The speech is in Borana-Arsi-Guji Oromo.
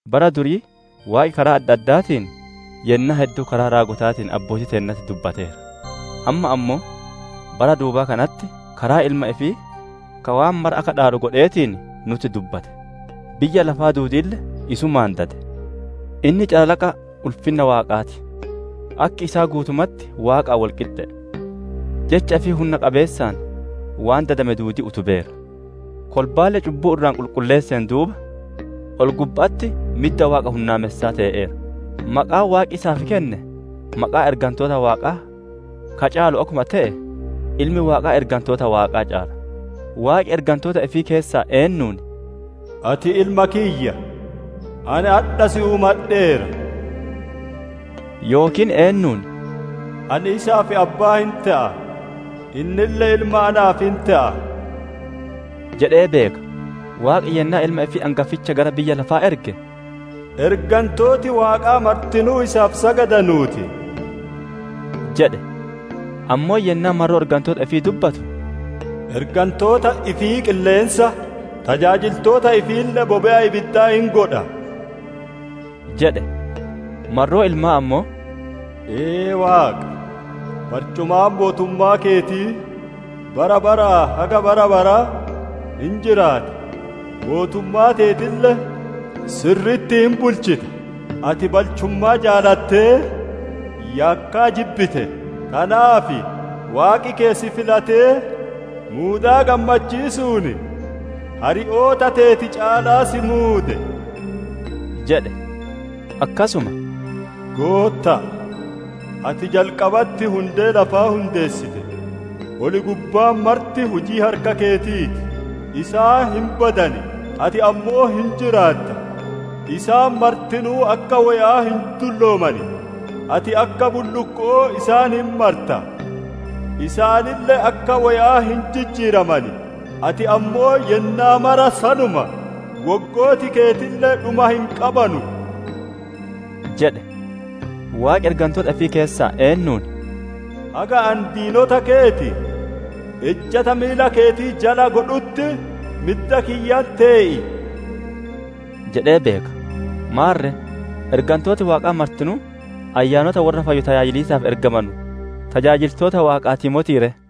Bara durii Waaqi karaa adda addaatiin, yennaa hedduu karaa raagotaatiin abbootii teennatti dubbateera. Ammaa ammoo bara duubaa kanatti karaa Ilma ifii ka waan mara akka dhaalu godheetiin nutti dubbate; biyya lafaa duudiille isumaan dade. Inni calalaqa ulfinna Waaqaa ti; akki isaa guutumatti Waaqaan wol qixxe'e. Jecha ifii hunna qabeessaan waan dadame duudii utubeera. Kolbaalle cubbuu irraa qulqulleesseen duuba, ol gubba'atti midda Waaqa hunnaamessaa tee'eera. Maqaan Waaqi isaaf kenne maqaa ergantoota Waaqaa ka caalu akkuma te'e, Ilmi Waaqaa ergantoota Waaqaa caala. Waaqi ergantoota ifii keessaa eennuun, «Ati Ilma kiyya, ani adha si uumadheera» yookiin eennuun, «Ani isaaf Abbaa hin te'a, innille Ilma naaf hin te'a» jedhee beeka? Waaqi yennaa Ilma ifii angaficha gara biyya lafaa erge, «Ergantooti Waaqaa martinuu isaaf sagadanuu ti» jedhe. Ammoo yennaa marroo ergantoota ifii dubbatu, «Ergantoota ifii qilleensa, tajaajiltoota ifiille bobe'a ibiddaa hin godha» jedhe. Marroo Ilmaa ammoo, «Ee Waaqa, barcumaan mootummaa keetii bara baraa haga bara baraa hin jiraata; mootummaa teetille sirri'itti hin bulchita. Ati balchummaa jaalatee yakkaa jibbite; tanaaf Waaqi keeti si filatee, muudaa gammachiisuun hari'oota teeti caalaa si muude» jedhe. Akkasuma, «Gootta'a, ati jalqabatti hundee lafaa hundeessite; ol gubbaan marti hujii harka keetii ti. Isaan hin badan; ati ammoo hin jiraatta; isaan martinuu akka woya'aa hin dullooman. Ati akka bullukko'oo isaan hin marta; isaaniille akka woya'aa hin jijjiiraman. Ati ammoo yennaa mara sanuma; woggooti keetille dhuma hin qabanu» jedhe. Waaqi ergantoota ifii keessaa eennuun, «Haga ani diinota keeti ejjata miila keetii jala godhutti midda kiyyatti tee'i!» jedhee beeka? Maarre, ergantooti Waaqaa martinuu ayyaanota worra fayyu tajaajiliisaaf ergamanu, tajaajiltoota Waaqaatii motii ree?